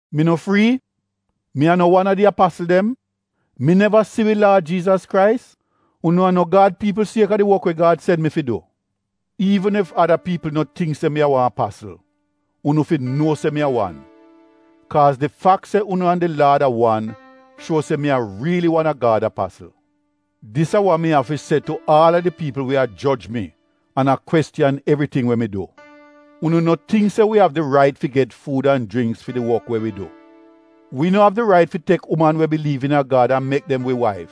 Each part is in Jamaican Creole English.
Mi no frii? Mi a no wan a di apasl dem? Mi neva si wi Laad Jiizas Krais? Unu a no Gad piipl sieka did wok we Gad sen mi fi du? Iivn ef ada piipl no tingk se mi a wan apasl, unu fi nuo se mi a wan! Kaaz di fak se unu an di Laad a wan shuo se mi a riili wan a Gad apasl. Dis a wa mi av fi se tu aal a di piipl we a joj mi an a kwestiyan evriting we mi du. Unu no tingk se wi av di rait fi get fuud an jringks fi di wok we wi du? Wi no av di rait fi tek uman we biliiv iina Gad an mek dem wi waif,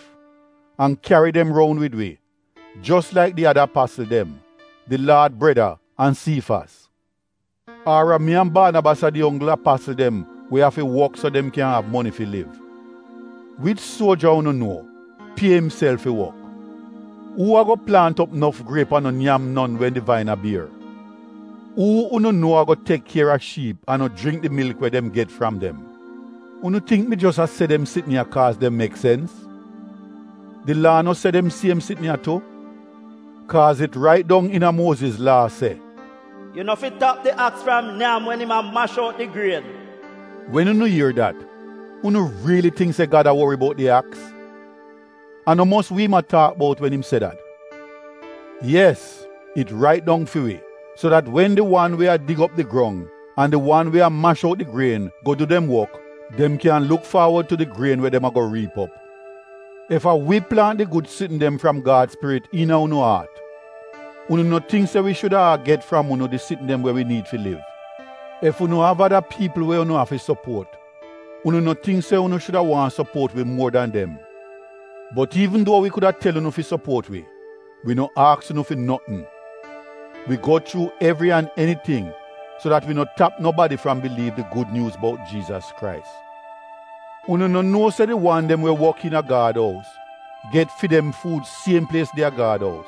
an kyari dem roun wid wi, jos laik di ada apasl dem, di Laad breda an Siifas? Ar a mi an Baanabas a di onggl apasl dem we afi wok so dem kyan av moni fi liv? Wich suoja unu nuo pie imself fi wok? Uu ago plaant op nof griep an no nyam non wen di vain a bier? Uu unu nuo ago tek kier a shiip an no jringk di milk we dem get fram dem? Unu tingk mi jos a se dem sitn ya kaaz dem mek sens? Di Laa no se dem siem sitn ya tu? Kaaz it rait dong iina a Muoziz laa se, “Yu no fi tap di aks fram nyam wen im a mash out di grien.” Wen unu ier dat, unu riili tingk se Gad a wori bout di aks? A no mos wi im a taak bout wen im se dat? Yes, it rait dong fi wi, so dat wen di wan we a dig op di grong an di wan we a mash out di grien go du dem wok dem kyan luk faawod tu di grien we dem ago riip op. Ef a wi plaant di gud sitn dem fram Gad Spirit iina unu aat, unu no tingk se wi shuda a get fram unu di sitn dem we wi niid fi liv? Ef unu av ada piipl we unu afi sopuot, unu no tingk se unu shuda waahn sopuot wi muor dan dem? Bot iivn duo wi kuda tel unu fi sopuot wi, wi no aks unu fi notn. Wi go chuu evri an eniting so dat wi no tap nobadi fram biliiv di Gud Nyuuz bout Jiizas Krais. Unu no nuo se di wan dem we wok iina Gad ous get fi dem fuud siem plies de a Gad ous?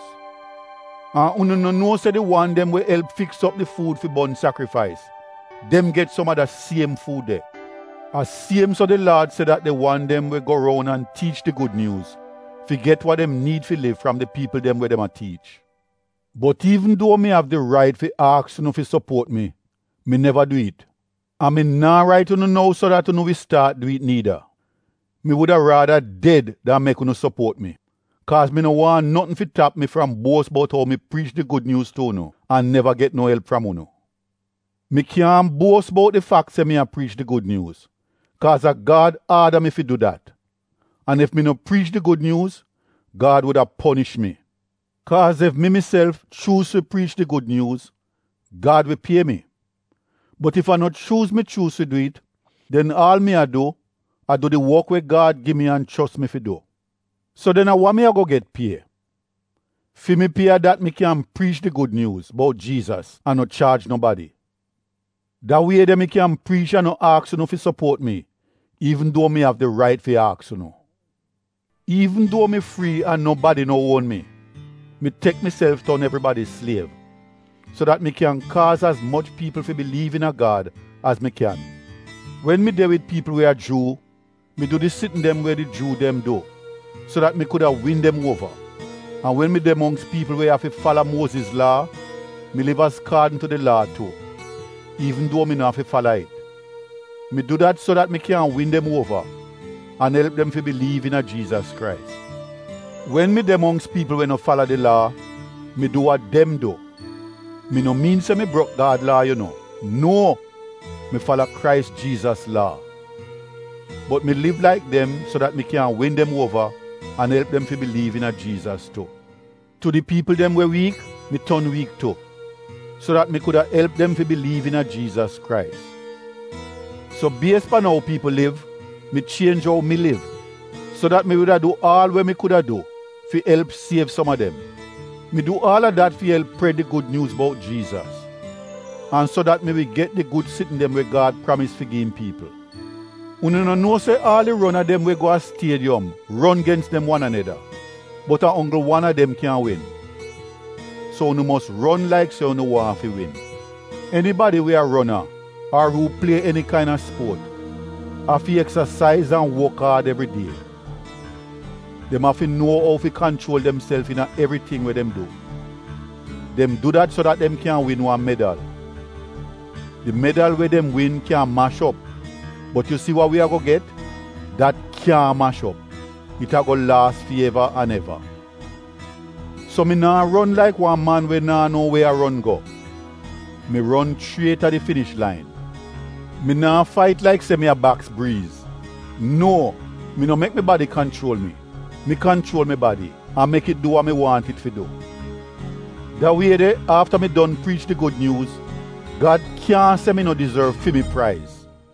An unu no nuo se di wan dem we elp fi fiks op di fuud fi bon sakrifais — dem get som a da siem fuud de? A siem so di Laad se dat di wan dem we go roun an tiich di Gud Nyuuz fi get wa dem niid fi liv fram di piipl dem we dem a tiich. Bot iivn duo mi av di rait fi aks unu fi sopuot mi, mi neva du it. An mi naa rait unu nou so dat unu wi staat du it niida. Mi wuda raada ded dan mek unu sopuot mi. Kaaz mi no waahn notn fi tap mi fram buos bout ou mi priich di Gud Nyuuz tu unu an neva get no elp fram unu. Mi kyaahn buos bout di fak se mi a priich di Gud Nyuuz kaaz a Gad aada mi fi du dat. An ef mi no priich di Gud Nyuuz, Gad wuda ponish mi. Kaaz ef mi miself, chuuz fi priich di Gud Nyuuz, Gad wi pie mi. Bot ef a no chuuz mi chuuz fi du it, den aal mi a du a du di wok we Gad gi mi an chos mi fi du. So den a wa mi ago get pie? Fi mi pie a dat mi kyan priich di Gud Nyuuz bout Jiizas an no chaaj nobadi. Da wie de mi kyan priich an no aks unu fi sopuot mi iivn duo mi av di rait fi aks unu. Iivn duo mi frii an nobadi no uon mi, mi tek miself ton evribadi sliev, so dat mi kyan kaaz az moch piipl fi biliiv iina Gad az mi kyan. Wen mi de wid piipl we a Juu, mi du di sitn dem we di Juu dem du so dat mi kuda win dem uova. An wen mi de mongks piipl we afi fala Muoziz laa, mi liv azkaadn tu di laa tu, iivn duo mi no afi fala it. Mi du dat so dat mi kyan win dem uova an elp dem fi biliiv iina Jiizas Krais. Wen mi de mongks piipl we no fala di laa, mi du wa dem du — mi no miin se mi brok Gad laa yu no, nuo, mi fala Krais Jiizas laa. Bot mi liv laik dem so dat mi kyan win dem uova an elp dem fi biliiv iina Jiizas tu. Tu di piipl dem we wiik mi ton wiik tu, so dat mi kuda elp dem fi biliiv iina Jiizas Krais. So bies pan ou piipl liv, mi chienj ou mi liv so dat mi wuda du aal we mi kuda du fi elp siev som a dem. Mi du aal a dat fi elp pred di Gud Nyuuz bout Jiizas, an so dat mi wi get di gud sitn dem we Gad pramis fi gi im piipl. Unu no nuo se aal di rona dem we go a stiediyom ron gens dem wan aneda, bot a onggl wan a dem kyan win? So unu mos ron laik se unu waahn fi win. Enibadi we a rona ar uu plie eni kaina spuot afi eksasaiz an wok aad evridie. Dem afi nuo ou fi kanchuol demself iina evriting we dem du. Dem du dat so dat dem kyan win wan medal. Di medal we dem win kyan mash op bot yu si wa wi ago get, dat kyaahn mash op — it ago laas fi eva an eva. So mi naa ron laik wan man we naa no we a ron go — mi ron chriet a di finish lain. Mi naa fait laik se mi a baks briiz. Nuo mi no mek mi badi kanchuol mi, mi kanchuol mi badi an mek it du wa mi waahn it fi du. Da wie de afta mi don priich di Gud Nyuuz Gad kyaahn se mi no dizorv fi mi praiz.